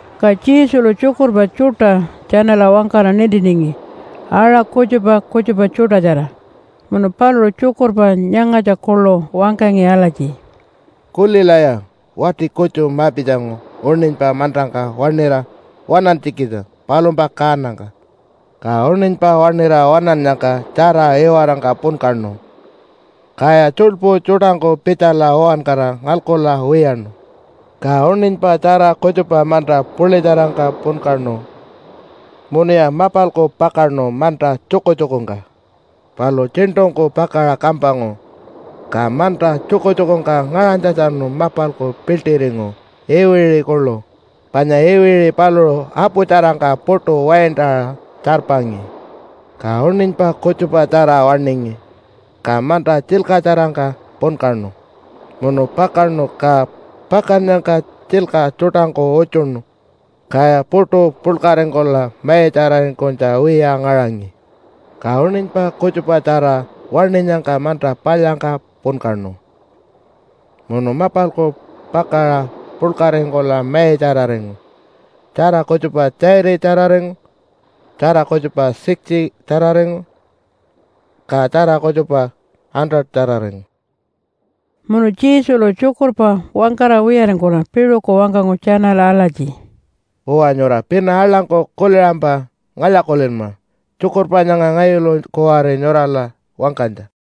Ka Jesulu tjukurpa tjuṯa tjanala wangkara nintiningi aṟa kutjupa kutjupa tjuṯatjara. Munu paluṟu tjukurpa nyangatja kuḻu wangkangi alatji, “Kulilaya! Wati kutju ma-pitjangu uṉinypa mantangka waṉira waṉantjikitja palumpa kaanangka. Ka uṉinypa waṉira waṉannyangka tjara iwarangka punkaṉu, kaya tjuḻpu tjuṯangku pitjala uwankara ngalkula wiyaṉu. Ka uṉinypa tjara kutjupa manta puḻitjarangka punkaṉu munuya mapalku pakaṉu manta tjukutjukungka. Palu tjiṉṯungku pakaṟa kampangu, ka manta tjukutjukungka ngaṟanytjatjanu mapalku piḻṯiringu iwiṟi kuḻu panya iwiṟi paluṟu aputjarangka puṯu waintaṟa tjarpangi. Ka uṉinypa kutjupatjara waṉingi, ka manta tjilkatjarangka punkaṉu munu pakaṉu, ka pakannyangka tjilka tjuṯangku utjuṉu, kaya puṯu puḻkaringkula maitjararingkunytja wiya ngaṟangi. Ka uṉinypa kutjupatjara waṉinyangka manta palyangka punkaṉu munu mapalku pakaṟa puḻkaringkula maitjararingu, tjara kutjupa 30-tjararingu, tjara kutjupa 60-tjararingu, ka tjara kutjupa 100-tjararingu.” Munu Jesulu tjukurpa wangkara wiyaringkula piṟuku wangkangu tjanala alatji, “Uwa, nyura pina aḻangku kuliṟampa ngalya-kulinma tjukurpa nyanga ngayulu kuwari nyurala wangkanytja.”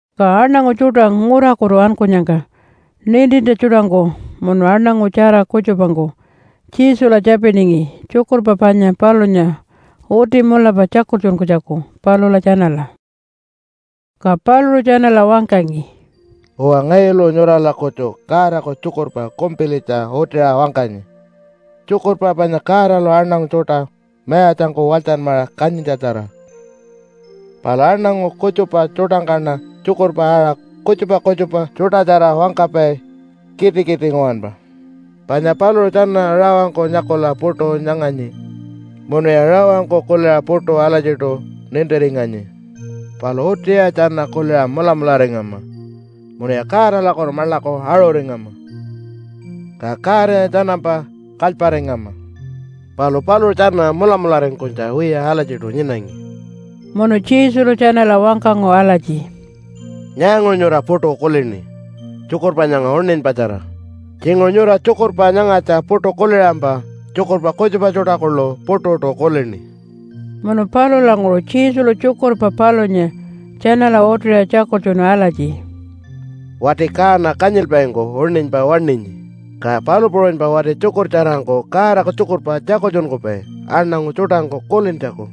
Ka aṉangu tjuṯa ngurakutu ankunyangka nintintja tjuṯangku munu aṉangu tjara kutjupangku Jesula tjapiningi tjukurpa panya palunya uti mulapa tjakultjunkunytjaku palula tjanala. Ka paluṟu tjanala wangkangi, “Uwa, ngayulu nyurala kutju Godaku tjukurpa kumpilitja utiṟa wangkanyi, tjukurpa panya Godalu aṉangu tjuṯa mayatjangku walytjanmaṟa kanyintjatjara. Palu aṉangu kutjupa tjuṯangkaṉa tjukurpa aṟa kutjupa kutjupa tjuṯatjara wangkapai kitikiti nguwanpa. Panya paluṟu tjana rawangku nyakula puṯu nyanganyi munuya rawangku kuliṟa puṯu alatjiṯu nintiringanyi. Palu utiya tjana kuliṟa mulamularingama munuya Godalakutu maḻaku aṟuringama, ka Godanya tjanampa kalyparingama. Palu paluṟu tjana mulamularingkunytja wiya alatjiṯu nyinangi.” Munu Jesulu tjanala wangkangu alatji, “Nyaanguṟu nyura puṯu kulini tjukurpa nyanga uṉinypatjara? Tjinguṟu nyura tjukurpa nyangatja puṯu kuliṟampa tjukurpa kutjupa tjuṯa kuḻu puṯuṯu kulini.” Munu palulanguṟu Jesulu tjukurpa palunya tjanala utiṟa tjakultjunu alatji, “Wati kaana kanyilpaingku uṉinypa waṉinyi, ka palu puṟunypa wati tjukurtjarangku Godaku tjukurpa tjakultjunkupai aṉangu tjuṯangku kulintjaku.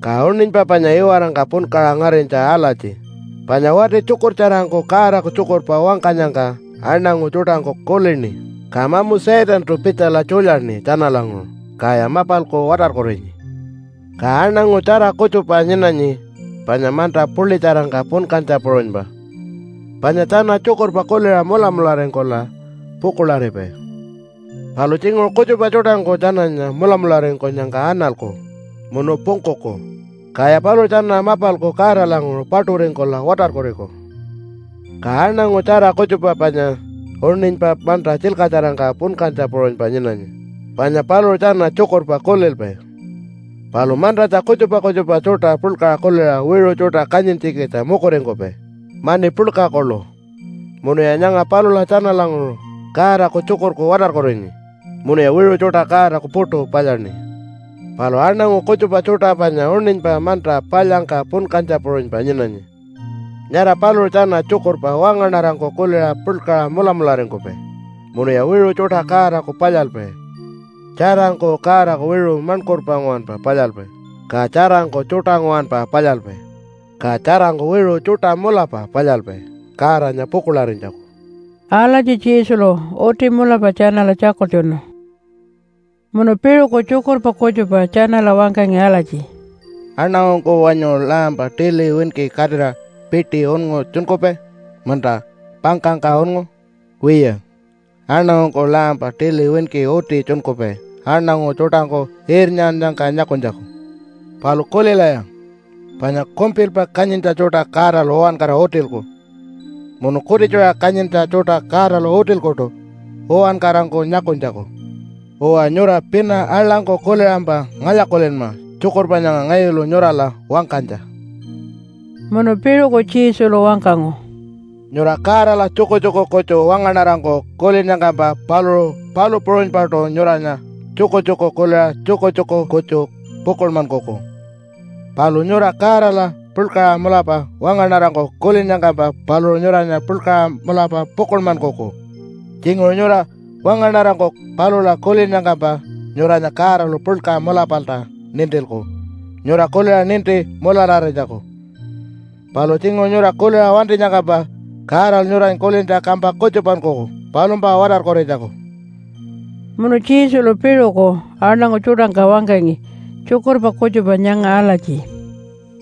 Ka uṉinypa panya iwarangka punkaṟa ngarinytja alatji, panya wati tjukurtjarangku Godaku tjukurpa wangkanyangka aṉangu tjuṯangku kulini, ka mamu Satantu pitjala tjulyaṉi tjanalanguṟu, kaya mapalku watarkurinyi. Ka aṉangu tjara kutjupa nyinanyi panya manta puḻitjarangka punkantja puṟunypa panya tjana tjukurpa kuliṟa mulamularingkula pukuḻaripai. Palu tjinguṟu kutjupa tjuṯangku tjananya mulamularingkunyangka analku munu pungkuku, kaya paluṟu tjana mapalku Godalanguṟu paṯuringkula watarkuriku. Ka aṉangu tjara kutjupa panya uṉinypa manta tjilkatjarangka punkantja puṟunypa nyinanyi, panya paluṟu tjana tjukurpa kulilpai. Palu mantatja kutjupa kutjupa tjuṯa puḻkaṟa kuliṟa wiṟu tjuṯa kanyintjikitja mukuringkupai mani puḻka kuḻu munuya nyanga palula tjanalanguṟu Godaku tjukurku watarkurinyi munuya wiṟu tjuṯa Godaku puṯu palyaṉi. Palu aṉangu kutjupa tjuṯa panya uṉinypa manta palyangka punkantja puṟunypa nyinanyi. Nyara paluṟu tjana tjukurpa wangaṉarangku kuliṟa puḻkaṟa mulamularingkupai munuya wiṟu tjuṯa Godaku palyalpai tjarangku Godaku wiṟu maṉkurpa nguwanpa palyalpai, ka tjarangku tjuṯa nguwanpa palyalpai, ka tjarangku wiṟu tjuṯa mulapa palyalpai Godanya pukuḻarinytjaku.” Alatji Jesulu uti mulapa tjanala tjakultjunu. Munu piṟuku tjukurpa kutjupa tjanala wangkangi alatji, “Aṉangungku wanyu lampa tili winki katira piti unngu tjunkupai munta pangkangka unngu? Wiya, aṉangungku lampa tili winki uti tjunkupai aṉangu tjuṯangku irnyannyangka nyakunytjaku. Palu kulilaya, panya kumpilpa kanyintja tjuṯa Godalu wangkara utilku munu kutitjuṟa kanyintja tjuṯa Godalu utilkuṯu uwankarangku nyakunytjaku. Uwa, nyura pina aḻangku kuliṟampa ngalya-kulinma tjukurpa nyanga ngayulu nyurala wangkanytja.” Munu piṟuku Jesulu wangkangu, “Nyura Godala tjukutjuku kutju wangaṉarangku kulinnyangkampa, paluṟu palu puṟunypaṯu nyuranya tjukutjuku kuliṟa tjukutjuku kutju pukuḻmankuku. Palu nyura Godala puḻkaṟa mulapa wangaṉarangku kulinnyangkampa, paluṟu nyuranya puḻkaṟa mulapa pukuḻmankuku. Tjinguṟu nyura wangaṉarangku palula kulinnyangkampa, nyuranya Godalu puḻka mulapalta nintilku nyura kuliṟa ninti mulararinytjaku. Palu tjinguṟu nyura kuliṟa wantinyangkampa, Godalu nyuranya kulintja kampa kutjupankuku palumpa watarkurinytjaku.” Munu Jesulu piṟuku aṉangu tjuṯangka wangkangi tjukurpa kutjupa nyanga alatji,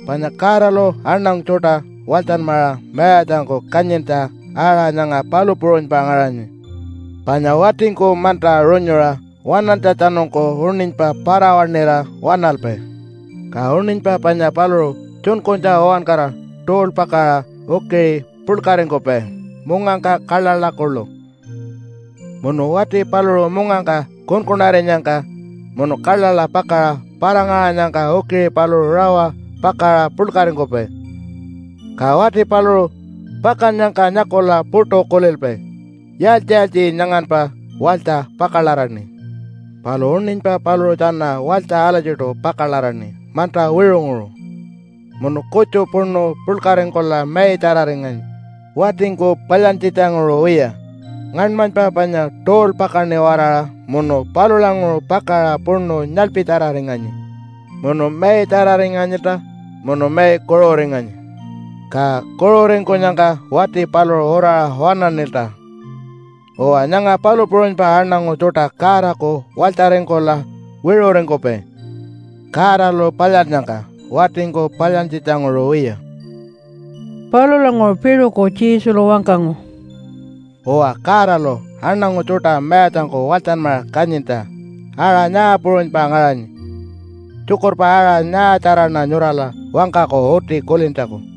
“Panya Godalu aṉangu tjuṯa walytjanmaṟa mayatjangku kanyintja aṟa nyanga palu puṟunypa ngaṟanyi, panya watingku manta runyuṟa waṉantjatjanungku uṉinypa para-waṉira waṉalpai. Ka uṉinypa panya paluṟu tjunkunytja uwankara tuulpakaṟa ukiṟi puḻkaringkupai mungangka kaḻaḻa kuḻu. Munu wati paluṟu mungangka kunkunarinyangka munu kaḻaḻa pakaṟa para-ngaṟanyangka ukiṟi paluṟu rawa pakaṟa puḻkaringkupai. Ka wati paluṟu pakannyangka nyakula puṯu kulilpai, ‘Yaaltji-yaaltji nyanganpa walytja pakalaraṉi?’ Palu uṉinypa paluṟu tjana walytja alatjiṯu pakalaraṉi manta wiṟunguṟu, munu kutju puṉu puḻkaringkula maitjararinganyi, watingku palyantjitjanguṟu wiya. Ngaṉmanypa panya tuulpakaṉi-waraṟa munu palulanguṟu pakaṟa puṉu nyaḻpitjararinganyi munu maitjararinganyilta, munu mai kuṟuringanyi. Ka kuṟuringkunyangka wati paluṟu uraṟa waṉaṉilta. Uwa, nyanga palu puṟunypa aṉangu tjuṯa Godaku walytjaringkula wiṟuṟingkupai Godalu palyannyangka, watingku palyantjitjanguṟu wiya.” Palulanguṟu piṟuku Jesulu wangkangu, “Uwa, Godalu aṉangu tjuṯa mayatjangku walytjanmaṟa kanyintja aṟa nyaa puṟunypa ngaṟanyi? Tjukurpa aṟa nyaatjaraṉa nyurala wangkaku uti kulintjaku?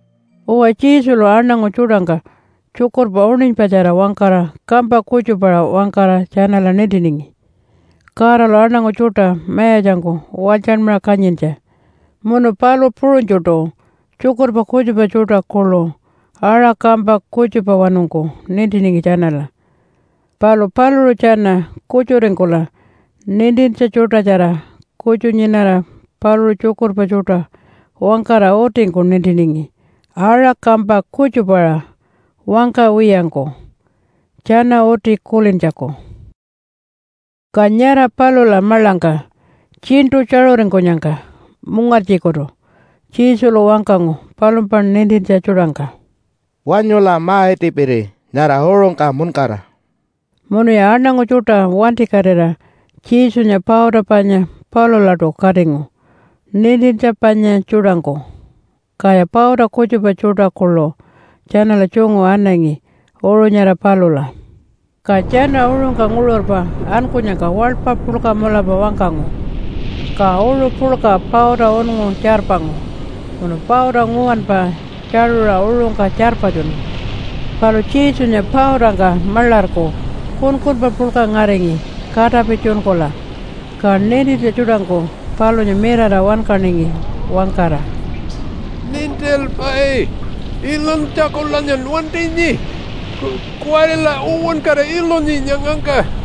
Uwa, Jesulu aṉangu tjuṯangka tjukurpa uṉinypatjara wangkara kampa kutjupaṟa wangkara tjanala nintiningi Godalu aṉangu tjuṯa mayatjangku walytjanmaṟa kanyintja. Munu palu puṟunytjuṯu tjukurpa kutjupa tjuṯa kuḻu aṟa kampa kutjupawanungku nintiningi tjanala. Palu paluṟu tjana kutjuringkula nintintja tjuṯatjara kutju nyinara paluṟu tjukurpa tjuṯa wangkara utingku nintiningi aṟa kampa kutjupaṟa wangkawiyangku, tjana uti kulintjaku. Ka nyara palula maḻangka tjiṉṯu tjaṟuringkunyangka mungartjikutu Jesulu wangkangu palumpa nintintja tjuṯangka, “Wanyula ma-itipiri nyara uṟungka muṉkara.” Munuya aṉangu tjuṯa wantikatira Jesunya pauta panya palulaṯu katingu nintintja panya tjuṯangku, kaya pauta kutjupa tjuṯa kuḻu tjanala tjungu anangi uṟu nyara palula. Ka tjana uṟungka nguṟurpa ankunyangka waḻpa puḻka mulapa wangkangu, ka uṟu puḻka pauta unngu tjarpangu munu pauta nguwanpa tjaṟuṟa uṟungka tjarpatjunu. Palu Jesunya pautangka maḻarku kunkunpa puḻka ngaringi katapi tjunkula. Ka nintintja tjuṯangku palunya mirara wankaningi wangkara, “Nintilpai! Ilunytjakulanyan wantinyi? Kuwarila uwankara ilunyi nyangangka.”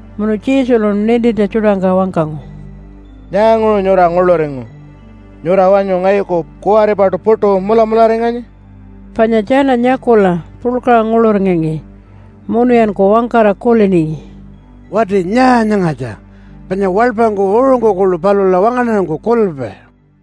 Munu Jesulu nintintja tjuṯangka wangkangu, “Nyaanguṟu nyura nguḻuringu? Nyura wanyu ngayuku kuwaripaṯu puṯu mulamularinganyi?” Panya tjana nyakula puḻkaṟa nguḻuringangi munuyanku wangkara kuliningi, “Wati nyaa nyangatja? Panya waḻpangku uṟungku kuḻu palula wangaṉarangku kulilpai.”